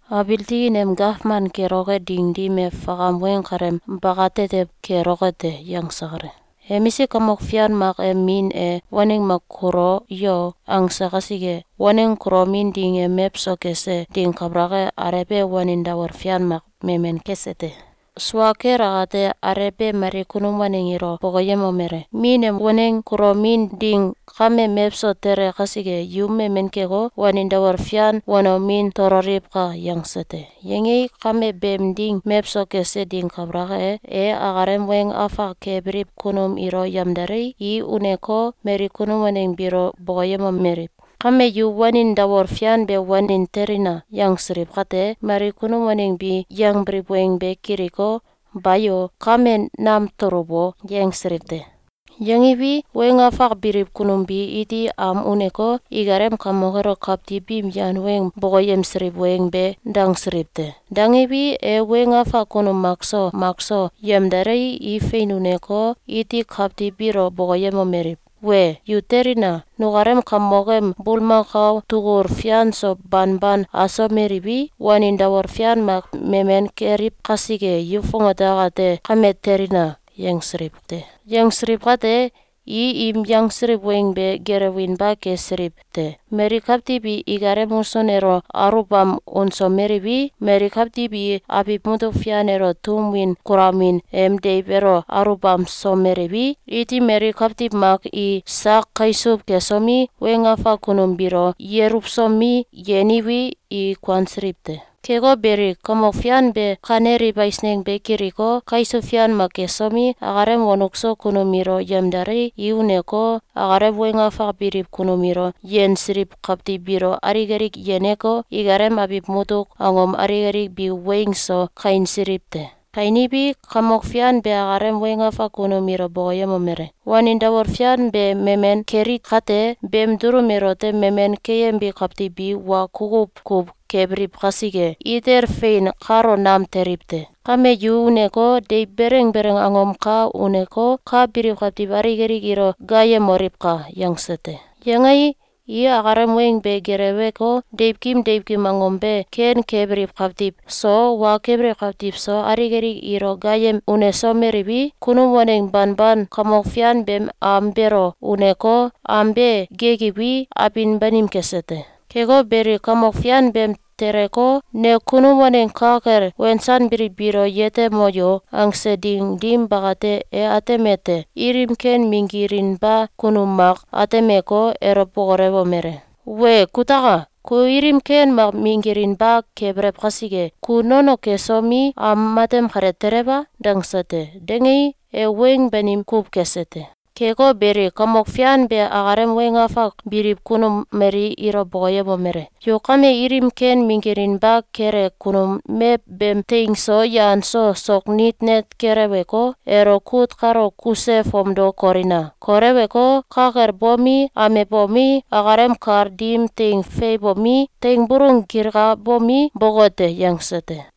“Abiil tikin em gawman keloke ding dim e fakam weng kaleem bakatetew keloke te.”, yangse kale. “Emisik kamok fian mak em min e ‘Waneng mak kulo yo!’, angse kasike, waneng kulomin ding em mewso kese ding kabalak e, alew e wanin dawol fian mak memen kese te. Sua kel akate, alew be mali kunum waneng ilo bokoyemomele: ‘Min em waneng kulomin ding kame mewso tele kasike, yu memen keko, wanin dawol fian wanomin tololiwka!’, yangse te. Yangei, kame beem ding mewso kese ding kabalak e, e akalem weng afak kebiliw kunum ilo yemdalei, i uneko, mali kunum waneng biilo bokoyemomeliw: ‘Kame yu wanin dawol fian be wanen telina!’, yangsiliw kate, mali kunum waneng bi yangbiliw weng be kiliko, ‘Bayo! Kame nam tuluw o!’, yangsiliw te. Yangiwi, weng afak biliw kunum bi iti am uneko, ikalem kamok elo kawtiw biim yan weng bokoyemsiliw weng be dangsiliw te. Dangiwi, e weng afak kunum makso makso yemdalei, i fein uneko, iti kawtiw biilo bokoyemomeliw: ‘Wee! Yu telina! Nukalem kamok em bulmakao tugul fian so banban asomeliwi, wanin dawol fian mak memen keliw kasike, yu fongate akate kame telina!’, yangsiliw te. Yangsiliw kate, i im yangsiliw weng be gelewinba kesiliw te. Mali kawtiw i ikalem musun elo aluwbam unsomeliwi, mali kawtiw i abiw mutuk fian elo tum win kulamin em deiw elo aluwbamsomeliwi, iti mali kawtiw mak i sak kaisuw kesomi, weng afak kunum biilo yeluwsomi, yeniwi, i kuansiliw te. Keko beli, kamok fian be kaneliw eisneng be kiliko, kaisuw fian mak kesomi, akalem wonuk so kunum ilo yemdalei, i uneko, akalem weng afak biliw kunum ilo yensiliw kawtiw biilo alik alik yeneko, ikalem abiw mutuk angom alik alik bi weing so kainsiliw te. Kainiwi, kamok fian be akalem weng afak kunum ilo bokoyemomele: ‘Wanin dawol fian be memen keli kate, beem dulum elote memen keyembi kawtiw bi wa kukuw kuw kebiliw kasike, itel fein kalo nam teliw te! Kame yu uneko, deiw beleng beleng angom ka uneko, ka biliw kawtiw alik alik ilo gaayemoliwka!’, yangse te. Yangei, i akalem weng be geleweko, deiwkim deiwkim angom be ken kebiliw kawtiw so, wa kebiliw kawtiw so, alik alik ilo gaayem unesomeliwi, kunum waneng banban kamok fian beem am beelo uneko, am be gekiwi, abin banim kese te. Keko beli, kamok fian beem teleko, ‘Ne kunum waneng ka kel wensanbiliw biilo yetemo yo!’, angse ding dim bakate, e atemete: Ilim ken minggilinba kunum mak atemeko, elo bokolewomele: ‘Wee kutaka! Ku ilim ken mak minggilinba kebelew kasike, ku nono kesomi, am matem kale telew a?’, dangse te. Dangei, e weng banim kuw kese te. Keko beli, kamok fian be akalem weng afak biliw kunum mali ilo bokoyemomele: ‘Yu kame ilim ken minggilinba kele kunum mew beem teing so yan so sok nit net keleweko, elo kut kalo kuse fomdo kolina! Koleweko, ka kel bomi, amebomi, akalem kal dim teing feiwbomi, teing bulung gilkabomi, boke te.’, yangse te.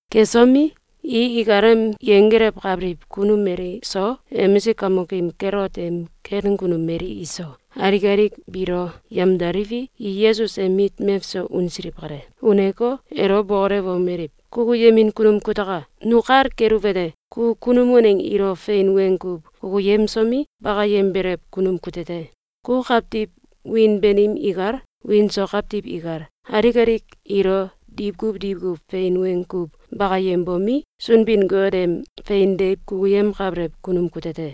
Kesomi, i ikalem yenggelewkabiliw kunum mali so, emisik kamokim Kelot em ken kunum mali iso, alik alik biilo yemdaliwi, i Yesus em mit mewso unsiliw kale. Uneko, elo bokolewomeliw: “Kukuyemin kunum kutaka! Nu kal keluwete: Ku kunum waneng ilo fein weng kuw kukuyemsomi, bakayembelew kunum kute te! Ku kawtiw wiin banim ikal, wiin so kawtiw ikal, alik alik ilo diwkuw diwkuw fein weng kuw bakayembomi, Sunbin-Got em fein deiw kukuyemkabelew kunum kute te.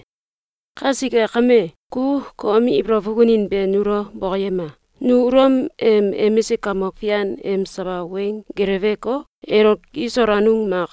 Kasike kame, ku kom ibolow fukunin be nulo bokoyema! Nu Ulom em emisik kamok fian em sawa weng geleweko, elo kisol anung mak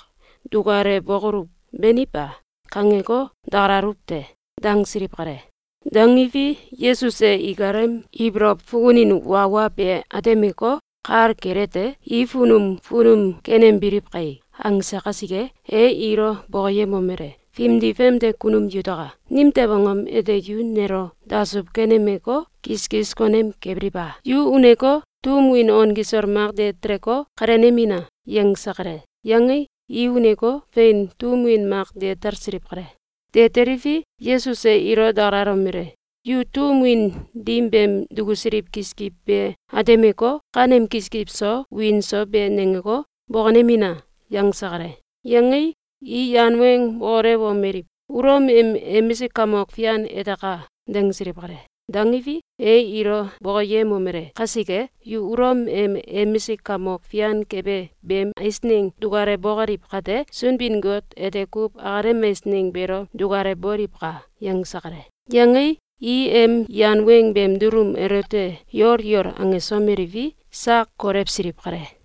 dukalewbokoluw, beni ba?’, kangeko, dakalaluw te.”, dangsiliw kale. Dangiwi, Yesus e ikalem ibolow fukunin wa wa be atemeko, kal kelete: ‘I funum funum kenembiliw kai!’, angse kasike, e ilo bokoyemomele: “Fimdi famde kunum yutaka! Nimtew angom ete yu nelo dasuw kenemeko, kiskis konem kebiliw a? Yu uneko, tum win on kisol mak de teleko, kalenemina!”, yangse kale. Yangei, i uneko, fein, tum win mak de talsiliw kale. De teliwi, Yesus e ilo dakalalomele: “Yu tum win dim beem dukusiliw kiskiw be atemeko, kanem kiskiw so, wiin so be nangeko, bokonemina!”, yangse kale. Yangei, i yan weng bokolewomeliw: “Ulom em emisik kamok fian eteka!”, dangsiliw kale. Dangiwi, e ilo bokoyemomele: “Kasike, yu Ulom em emisik kamok fian kebe beem eisneng dukalewbokoliw kate, Sunbin-Got ete kuw akalem eisneng beelo dukalewboliwka!”, yangse kale. Yangei, i em yan weng beem dulum elote yol yol angesomeliwi, sak kolewsiliw kale.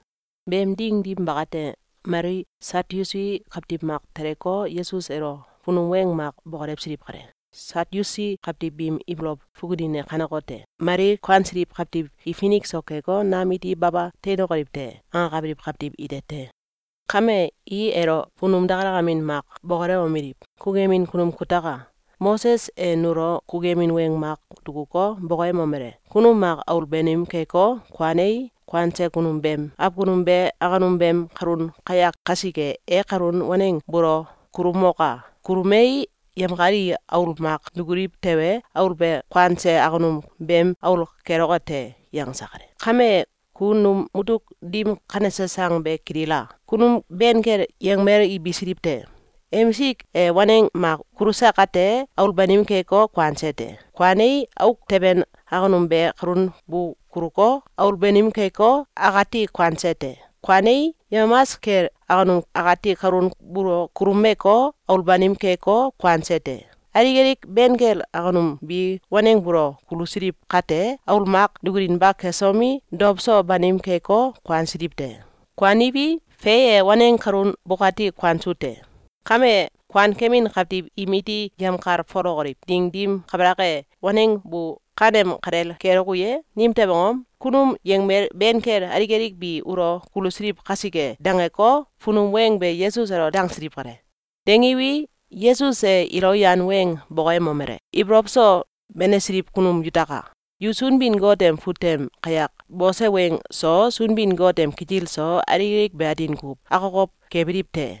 Beem ding dim bakate, mali Satyusi kawtiw mak teleko, Yesus elo funum weng mak bokolewsiliw kale. Satyusi kawtiw biim ibolow fukunin e kanekote: Mali kuansiliw kawtiw i finik so keko, nam iti baba teinokoliw te!’, angakabiliw kawtiw ite te. Kame, i elo funum dakalamin mak bokolewomeliw: “Kukuyemin kunum kutaka! Moses e nulo kukuyemin weng mak dukuko, bokoyemomele: ‘Kunum mak aul banim keko, kuanei, kuanse kunum beem awkunum be awkunum beem kalun kayak kasike, e kalun waneng buulo kuluumoka! Kuluumei, yemkal i aul mak dukuliw tewe, aul be kuanse awkunum beem aul keloke te.’, yangse kale. Kame, ku num mutuk dim kanese sang be kilila! Kunum ben kel yangmel i bisiliw te. Emisik e waneng mak kuluse kate, aul banim keko, kuanse te. Kuanei, auk teben awkunum be kalun bu kuluko, aul banim keko, akati kuanse te. Kuanei, yemamas kel awkunum akati kalun buulo kuluumeko, aul banim keko, kuanse te. Alik alik ben kel awkunum bi waneng buulo kulusiliw kate, aul mak dukulinba kesomi, dow so banim keko, kuansiliw te. Kuaniwi, fe e, waneng kalun bukati kuansu te. Kame, kuankemin kawtiw im iti yemkalfolokoliw ding dim kabalak e, waneng bu kanem kalel keloku ye? Nimtew angom? Kunum yangmel ben kel alik alik bi ulo kulusiliw kasike.”, dangeko, funum weng be Yesus elo dangsiliw kale. Dangiwi, Yesus e ilo yan weng bokoyemomele: “Ibolow so benesiliw kunum yutaka! Yu Sunbin-Got em fut tem kayak bose weng so, Sunbin-Got em kitil so, alik alik be atin kuw akokow kebiliw te!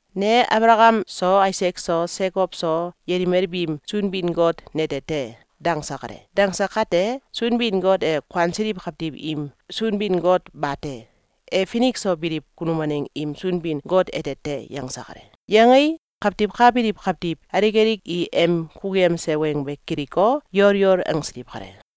‘Ne Abalakam so, Aisak so, Sekow so, yelimel biim Sunbin-Got nete te!’, dangse kale. Dangse kate, Sunbin-Got e kuansiliw kawtiw im Sunbin-Got bate! E finik so biliw kunum waneng im Sunbin-Got ete te!”, yangse kale. Yangei, kawtiw ka biliw kawtiw alik alik i em kukuyemse weng be kiliko, yol yol angsiliw kale.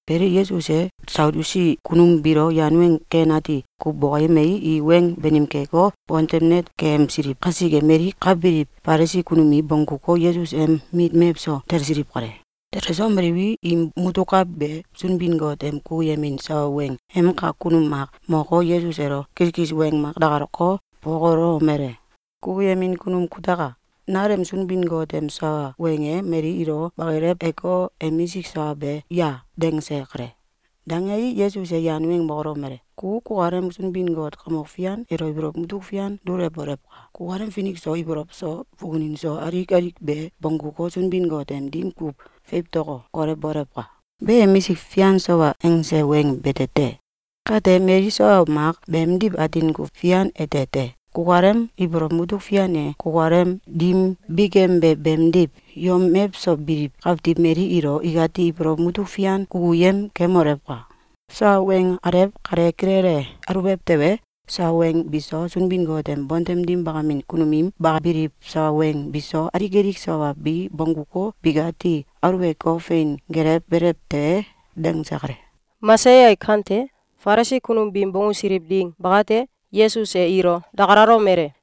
Beli, Yesus e Satyusi kunum biilo yan weng ken ati kuw bokoyemei, i weng banim keko, bontem net keyemsiliw kasike, mali ka biliw Falisi kunum i bongguko, Yesus em mit mewso talsiliw kale. Telesomeliwi, im mutuk ka be Sunbin-Got em kukuyemin sawa weng em kak kunum mak moko, Yesus elo kiskis weng mak dakalako, bokolewomele: “Kukuyemin kunum kutaka! Nalem Sunbin-Got em sawa weng e mali ilo bakileweko, emisik sawa be ya?”, dangse kale. Dangei, Yesus e yan weng bokolewomele: “Ku kukalem Sunbin-Got Kamok Fian elo ibolow mutuk fian dulewolewka! Kukalem finik so, ibolow so, fukunin so, alik alik be bongguko, Sunbin-Got em dim kuw fewtoko, kolew bolewka! Be emisik fian sawa angse weng bete te. Kate, mali sawa mak beemdiw atin kuw fian ete te. Kukalem ibolow mutuk fian e kukalem dim bikembe beemdiw, yom mewso biliw kawtiw mali ilo ikati ibolow mutuk fian kukuyem kemolewka! Sawa weng alew kale kilele aluwbew tewe, sawa weng biso, Sunbin-Got em bontem dim bakamin kunum im bakabiliw sawa weng biso, alik alik sawa bi bongguko, bikati aluweko, fein gelewbelew te!”, dangse kale. Falisi kunum biim bonggusiliw ding bakate, Yesus e ilo dakalalomele: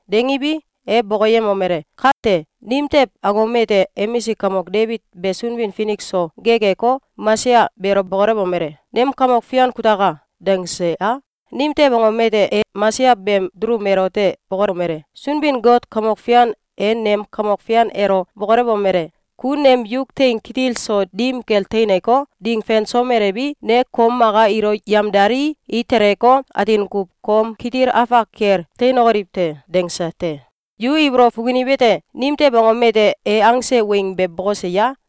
Dangiwi, e bokoyemomele: “Kate, nimtew angom ete emisik kamok Debit be Sunbin-Finik so gekeko, Mesaya beelo bokolewomele: ‘Nem kamok fian kutaka!’, dangse a? Nimtew angom ete e Mesaya beem dulum elote bokolomele: ‘Sunbin-Got Kamok Fian e nem Kamok Fian elo bokolewomele: ‘Ku nem yuk teing kitil so dim kel teineko, ding fensomelewi, ne kom maka ilo yemdalii, i teleko, atin kuw kom kitil afak kel teinokoliw te.’, dangse te.’, Yu ibolow fukuniwete: Nimtew angom ete e angse weng be bokose ya?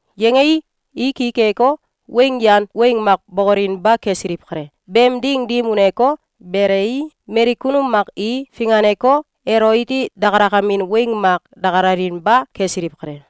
Yangei, i ki keko, weng yan weng mak bokolinba kesiliw kale. Beem ding dim uneko, belei, mali kunum mak i finganeko, elo iti dakalakamin weng mak dakalalinba kesiliw kale.